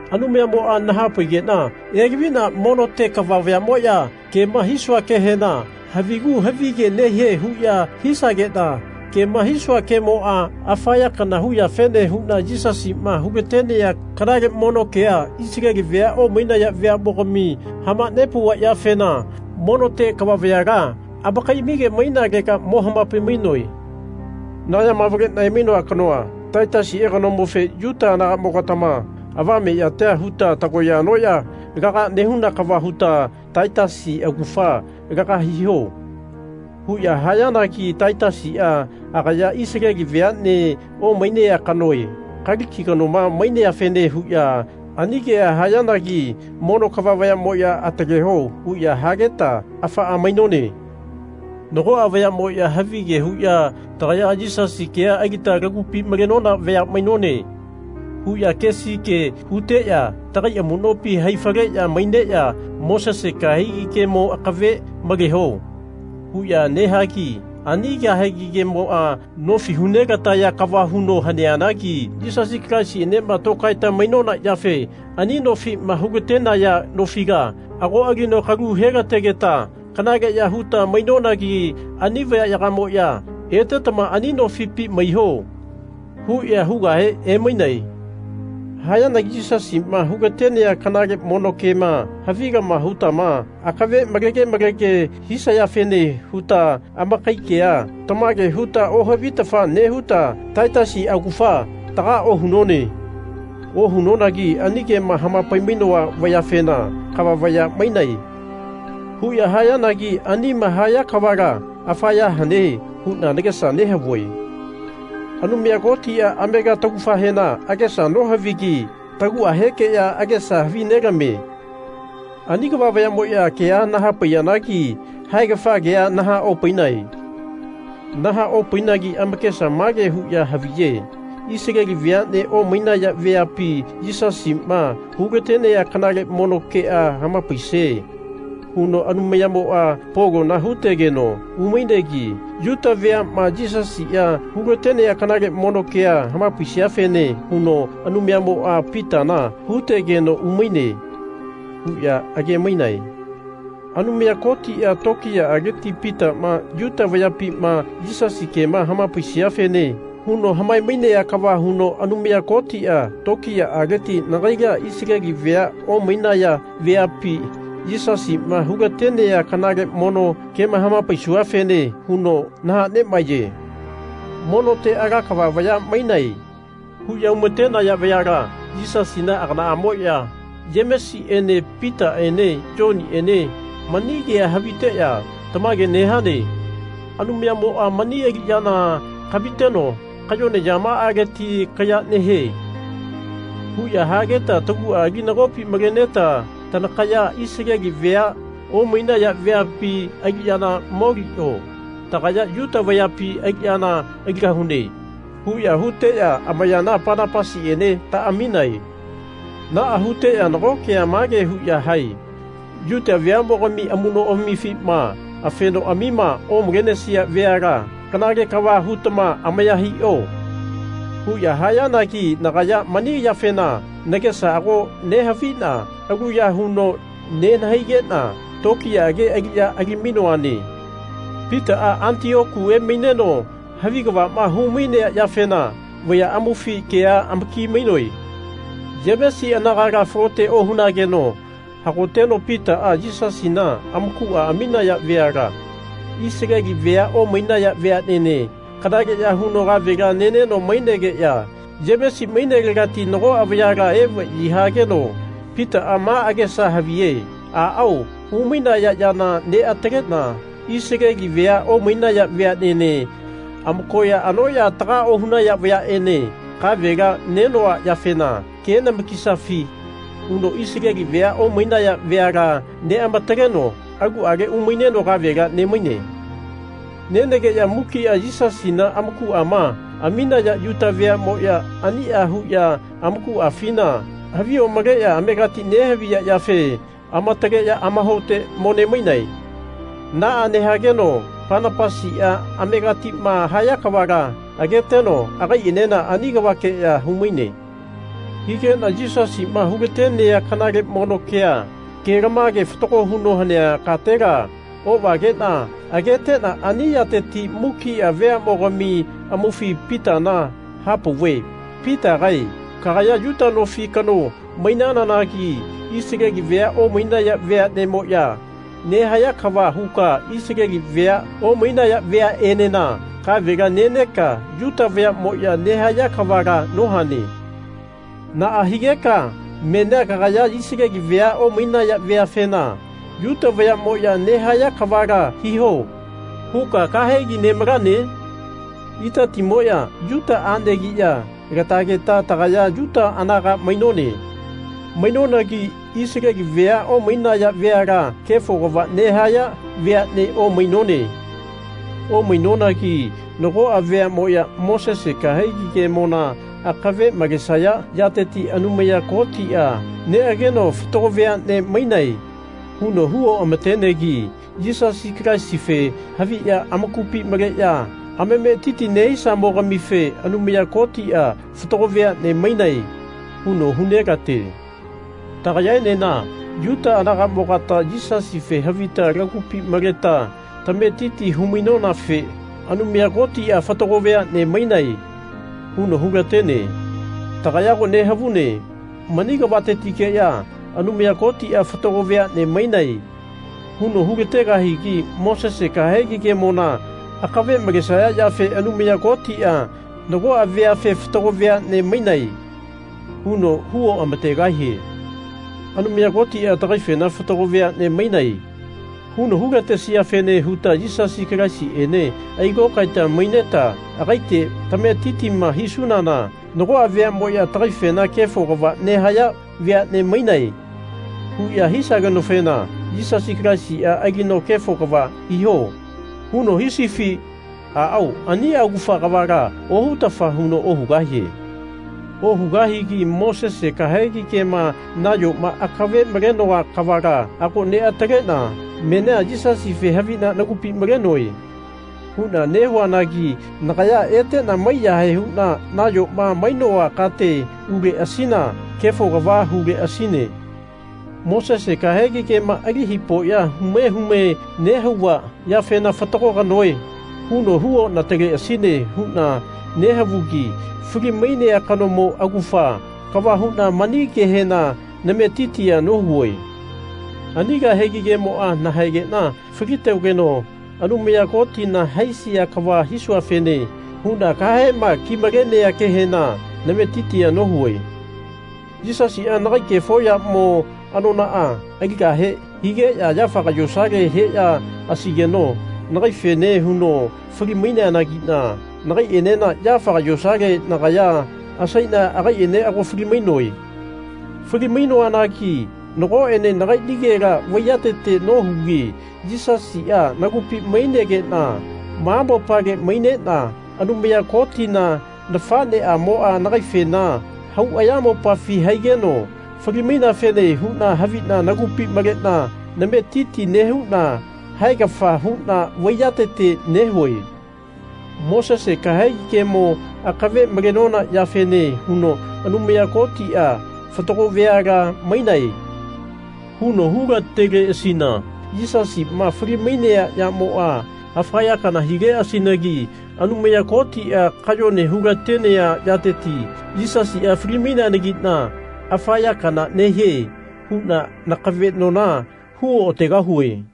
Anumayamoa nahapaigena elavina monote kava vayamoya kema hisua kehena havigu havige nehie huya hisagena kema hisua kemoa afa ya kana hu yafene huna Yisasima hulatenea kanale mono kea Isaleli vea omainaya veamogami hamanepauva yafena monote kava vayala amakaiamige mainalega mo hamapai-mainoe. Nagayama avalena emainoa kanoa Taitasie kanomofe Yuta anagamo-gatama avame yatia huta tagoya anoya laga nehuna kava huta Taitasi augafa laga hiho. huya hayanagi Taitasia agaya Isaleli veane omainea kanoe Kaliki kanoma maineafene huya ani kea hayanagi mono kava vayamoya Ataleo huya hageta afaa mainone. Nagoa vayamoya havige huya Tagaya Yisasi kea alita lagupi malenona vaya mainone. huya kesi ke huteya tagai amunopi hai faleya maineya Mosese kahegi kemo akave maleho. huya nehagi ani kahegi kemoa nofi hu nelataya kava huno haneanagi Yisasi Kalaisienema tokaeta mainona yafe ani nofima hulatenaya nofila ago alino kalu helategeta kanaleya huta mainonagi ani vayayagamoya Etetama ani nofipi maiho. huya hugahe emainae. Hayanagi Yisasima hulatenea kanale mono kema havilama hutama akave malege malege hisayafene huta amakai kea tamage huta ohavitafa nehuta Taitasi augafa taga ohunone. Ohunonagi ani kema hamapai-mainoa vayafena Kava vaya mainae. huya hayanagi anima haya kavala afa ya hane huna nagesa nehavue. Anumaya Kotia amega taugafahena agesa nohavigi taguahekeya agesa havi nelamie. Ani kava vayamoya kea nahapaiyanagi haegafa kea nahaopainae. Naha-opainagi amakesa mage huya haviye Isaleli veane omainaya veapi Yisasima hulatenea kanale mono kea hamapaisie huno Anumayamoa Polona hutegeno umainegi Yuta veama Yisasia hulatenea kanale mono kea hamapaisiafene huno Anumayamoa Pitana hutegeno umaine. huya agemainae. Anumaya Kotia tokiyaaleti Pitama Yuta vayapima Yisasi kema hamapaisiafene huno hamae-mainea kava huno Anumaya Kotia tokiyaaleti nagaila Isaleli vea omainaya veapi Yisasima hulatenea kanale mono kema hamapaisuafene huno nahanemaeye. Monote ala kava vaya mainae. huya humatenaya vayala Yisasina aganaamoa Yemesiene Pitaene Yoniene mani kea haviteya Tamage nehane. Anumayamoa mani aliyana kamiteno kayone yamaaleti kaya nehie. huya hageta tagua ali nagopi maleneta Tanakaya Isaleli vea omainaya veapi aliyana molio. Tagaya Yuta vayapi aliyana aligahune. huya huteya amayana Panapasiene taaminae. Naa huteya nago kea mage huya hae Yuta veamogami amunoamifima afenoamima omalenesia veala kanale kava hutana amaya hio. huya hayanagi nagaya mani yafena nagesa ago nehavina aluya huno nenahaigena tokiyaage aliya alimainoane. Pitaa Atioku emaineno havi kavama humainea yafena vaya amaufi kea amaki-mainoe. Yemesi anagala falote ohunageno hagoteno Pitaa Yisasina amakua aminaya veala, Isaleli vea omainaya veanene, kanaleya huno kavela neneno mainegeya Yemesi mainelegati nagoa vayala evayi hageno Pitaa ma agesa havie Aao humainaya yana neatalena Isaleli vea omainaya veanene, amakoya anoya taga ohunaya vayaene, kavela nenoa yafena ke namakisafi. huno Isaleli vea omainaya veala neamataleno aluale umaineno kavela nemaine. Nenegeya mukia Yisasina amakuama aminaya Yuta veamoya ania huya amakuafina havi omaleya amegati nehaviya yafe amataleya amahaote mo nemainae. Naa nehageno Panapasia amegatima haya kavala ageteno agaienena ani kavakeya humaine. Higena Yisasima hulatenea kanale mono kea, kelamage fatago huno hanea katela ovagena agetena ani yateti mukia veamogami amaufi Pitana hapauve Pitagae kagaya Yuta nofi kano mainananagi Isaleli vea omainaya veanemoya nehaya kava huka Isaleli vea omainaya veaenena kavela neneka Yuta vayamoya nehaya kavala nohane. Naa higeka menia kagaya Isaleli vea omainaya veafena Yuta vayamoya nehaya kavala hiho. huka kahegi nemalane? Itatimoya Yuta anegiya latageta tagaya Yuta anaga mainone. Mainonagi Isaleli vea omainaya veala kefo kava nehaya veane omainone. Omainonagi nagoa veamoya Mosese kahegi kemona akave malesaya yateti Anumaya Kotia neageno Fatago veane mainae. huno hu oamatenegi Yisasi Kalaisife haviya amakupi maleya amametiti nehisamogamife Anumaya Kotia Fatago veane mainae. huno hunelate. Tagayaenena Yuta anagamogata Yisasife havita lagupi maleta tametiti humainonafe Anumaya Kotia Fatago veane mainae. huno hulatene. Tagaya ago nehavune mani kavatetikeya Anumaya Kotia Fatago veane mainae. huno hulategahigi Mosese kahegi kemona akave malesaya yafe Anumaya Kotia nagoa veafe Fatago veane mainae. huno hu oamategahie. Anumaya Kotia takaifena Fatago veane mainae. huno hulatesiafene huta Yisasi Kalaisiene ailokaeta maineta agaite tametitima hisunana nagoa veamoya tagaifena Kefo kava nehaya veane mainae. huya hisagenofena Yisasi Kalaisia alino Kefo kava hiho. huno hisifi? Aao ania augafa kavala ohutafa huno ohugahie. Ohugahigi Mosese kahegi kema nayoma akave malenoa kavala ago neatalena menia Yisasife havina nagupi malenoe. huna nehuanagi nagaya etena maiyahae huna nayoma mainoa kate uleasina kefo kava huleasine. Mosese kahegi kema ali hipoya hume hume nehauva yafena Fatago kanoe. huno hu onateleasine huna nehavugi fali-mainea kanomo augafa kava huna mani kehena nametitia nohue. Ani kahegi kemoa nahaegena falitogeno Anumaya Kotina haisia kava hisuafene huna kahema ki-malenea kehena nametitia nohue. Yisasia nagai kefo yamo anonaa aligahe higeya yafaga yosale heya asaigeno nagaifene huno fali-maineanagina nagaienena yafaga yosale nagaya asaina agaiene ago fali-mainoe. Fali-mainoanagi nagoene nagainigela vaiyatete nohugi Yisasia nagupi mainegena ma mopale mainena Anumaya Kotina nafaneamoa nagaifena hau ayamopafi haigeno fali-maineafene huna havina nagupi malena nametiti nehuna haegafa huna vaiyatete nehue. Mosese kahegi kemo akave malenona yafene huno Anumaya Kotia Fatago veala mainae. huno hulateleasina Yisasima fali-mainea yamoa afa ya kana hileasinagi Anumaya Kotia kayone hulatenea yateti Yisasia fali-maineanagina afa ya kana nehie huna nakavenona huoategahue.